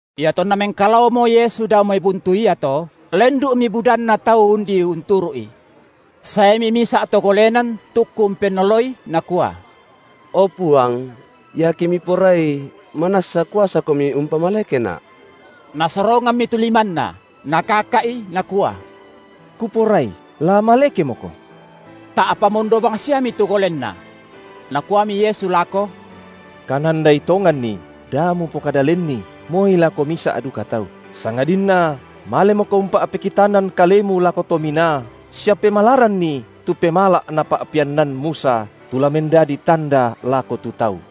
Iatonna mengkalaomo Yesu dao mai buntu iato, lendu’mi budanna tau undi unturu’I. Saemi misa’ to golenan tukku umpennoloi nakua: O Puang, iake Miporai, manassa kuasaKomi umpamalekena’. Nasorongammi tu limanNa, Nakaka’i, Nakua: Kuporai, la malekemoko! Ta’pa mondo bangsiami tu golenna. Nakuami Yesu lako: Kanandai tonganni, da mupokada lenni, moi lako misa’ duka tau, sangadinna malemoko umpa’pekitanan kalemu lako to minaa sia pemalaranni tu pemala’ napa’peannan Musa, tu la mendadi tanda lako tu tau.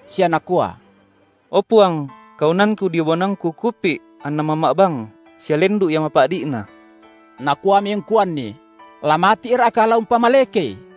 sia nakua: O Puang, kaunanku dio banuangku kupi’ anna mamma’bang, sia lendu’ ia mapa’di’na. Nakuami ungkuanni; la mati’Ra’ka la umpamalekei?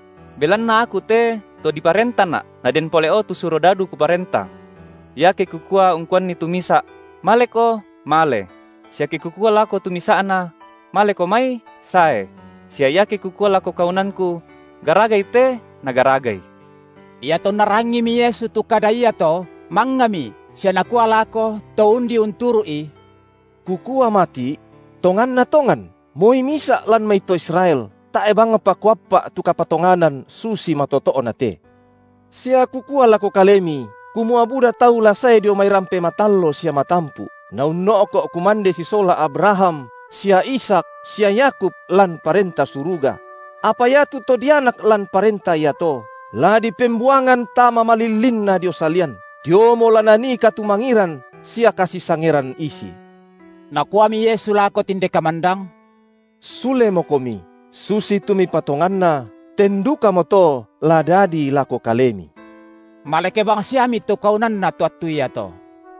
Belanna aku te to diparentana’, naden pole’o tu surodadu kuparenta. Iake kukua ungkuanni tu misa’: Maleko, male; sia ke kukua lako tu misa’na: Maleko mai, sae; sia iake kukua lako kaunanku: Garagai te, nagaragai. Iatonna rangimi Yesu tu kada iato mangngami sia Nakua lako to undi unturu’I: Kukua mati’: Tonganna tongan moi misa’ lan mai to Israel, tae’ bangpa Kuappa’ tu kapatonganan susi matoto’na te. Sia Kukua lako kalemi, kumua buda tau la sae dio mai rampe matallo sia matampu’, naunno’ko’ kumande sisola Abraham sia Ishak sia Yakub lan Parenta Suruga; apa iatu to dianak lan Parenta iato la dipembuangan tama malillinna dio salian, diomo la nanii katumangiran sia kasisangeran isi. Nakuami Yesu lako tinde kamandang: Sulemokomi, susitu mipatonganna ten dukamoto la dadi lako kalemi. Maleke bangsiami tu kaunanna to attu iato.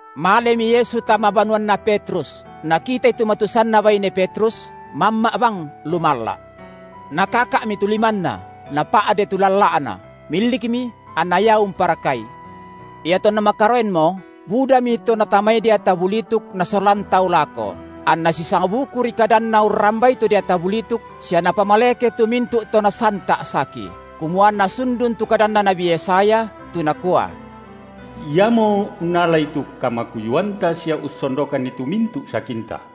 Malemi Yesu tama banuanna Petrus, Nakitai tu matusanna baine Petrus, mamma’ bang lumalla’. Nakaka’mi tu limanna, napa’de tu lalla’na; milikmi, anna ia umparakai. Iatonna makaroenmo budami to natamai deata bulituk nasolan tau lako, anNa sisangbukuri kadanNa urrambai tu deata bulituk sia Napamaleke tu mintu’ to nasanta’ saki, kumua anna sundun tu kadanna nabi Yesaya, tu nakua: Iamo unnalai tu kamakuyuanta sia ussondokanni tu mintu’ sakinta.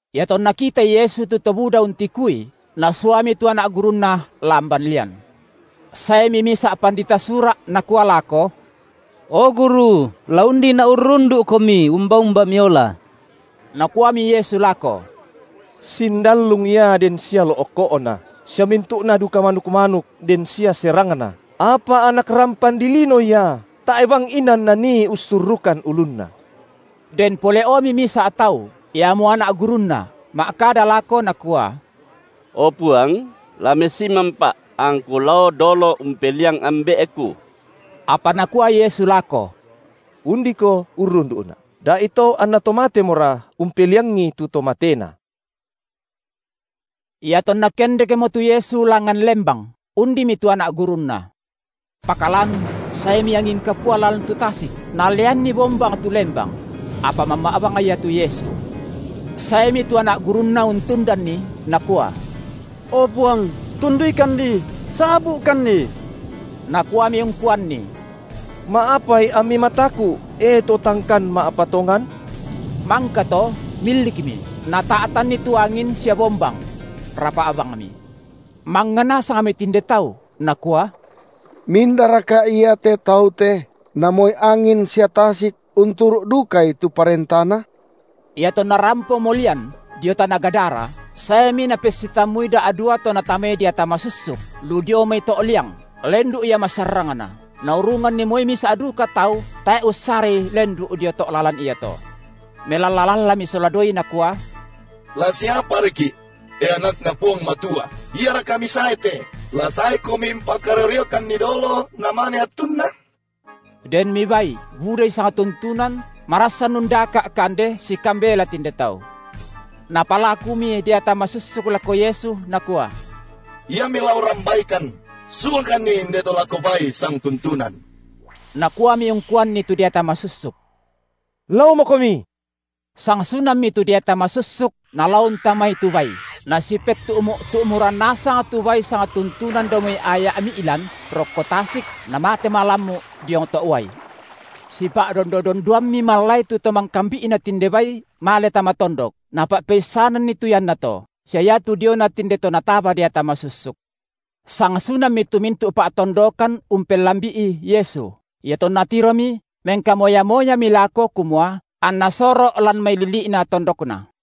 Iatonna kitai Yesu tu to buda untikui, Nasuami (tu anak gurunNa) lamban lian. Saemi misa’ pandita Sura’ nakua lako: O Guru, la undina’ urrundu’Komi umba-umba Miola. Nakuami Yesu lako: Sindallung ia den sia lo’ko’na, sia mintu’na duka manuk-manuk den sia serangna, apa Anak rampan dilino Ia tae’ bang inan nanii ussurrukan ulunNa. Den pole’omi misa’ tau, iamo anak gurunNa, ma’kada lako nakua: O Puang, la messimanpa’ angku lao dolo umpeliang ambe’ku. Apa Nakua Yesu lako: Undiko urrundu’Na’ da’ito anna to matemora umpeliangi tu to matena. IatonNa Kendekmo tu Yesu langan lembang, undimi tu anak gurunNa. Pakalan saemi angin kapua lan tu tasik, naleanni bombang tu lembang; apa mamma’ bang Ia tu Yesu. Saemi tu anak gurunNa untundanNi, nakua: O Puang, tunduikanni, sabu’kanni! Nakuami ungkuanni: Ma’apai ammi mataku’, e to tangkan ma’patongan? Mangkato milikmi, Nata’tanni tu angin sia bombang; rapa’ bangmi. Mangnga nasangmi tinde tau, nakua: Mindaraka Ia te Tau te, na moi angin sia tasik unturu’ dukai tu parentaNa? Iatonna rampomo lian dio tana Gadara, saemi napessitammui da’dua to natamai deata masussuk, lu dio mai to’ liang, lendu’ ia masarrangna, naurunganni moi misa’ duka tau tae’ ussarai lendu’ dio to’ lalan iato. Melalla-lallami sola duai nakua: La siaparaki’, e AnakNa Puang Matua? Iaraka Misae te, la saeKomi umpakario-riokanni dolo namane attunna? Denmi bai budai sangtuntunan marassan undaka’ kande sikambela tinde tau. Napalakumi deata masussuk lako Yesu nakua: IamMi la urrambaikan, suakanni inde to lako bai sangtuntunan. Nakuami ungkuanni tu deata masussuk: Laomokomi. Sangsunammi tu deata masussuk nalao untamai tu bai, nasipettu’mu’-tu’muran nasang tu bai sangtuntunan dao mai aya’ mi’lan rokko tasik namate malammu’ diong to’uai. Sipa’dondo-dondoammi mallai tu to mangkambi’na tinde bai male tama tondok, napa’peissananni tu iannato, sia iatu diona tinde to nataba deata masussuk. Sangsunammi tu mintu’ pa’tondokan umpellambi’i Yesu; iatonna tiromi, mengkamoya-moyami lako kumua anNa soro’ lan mai lili’na tondokna.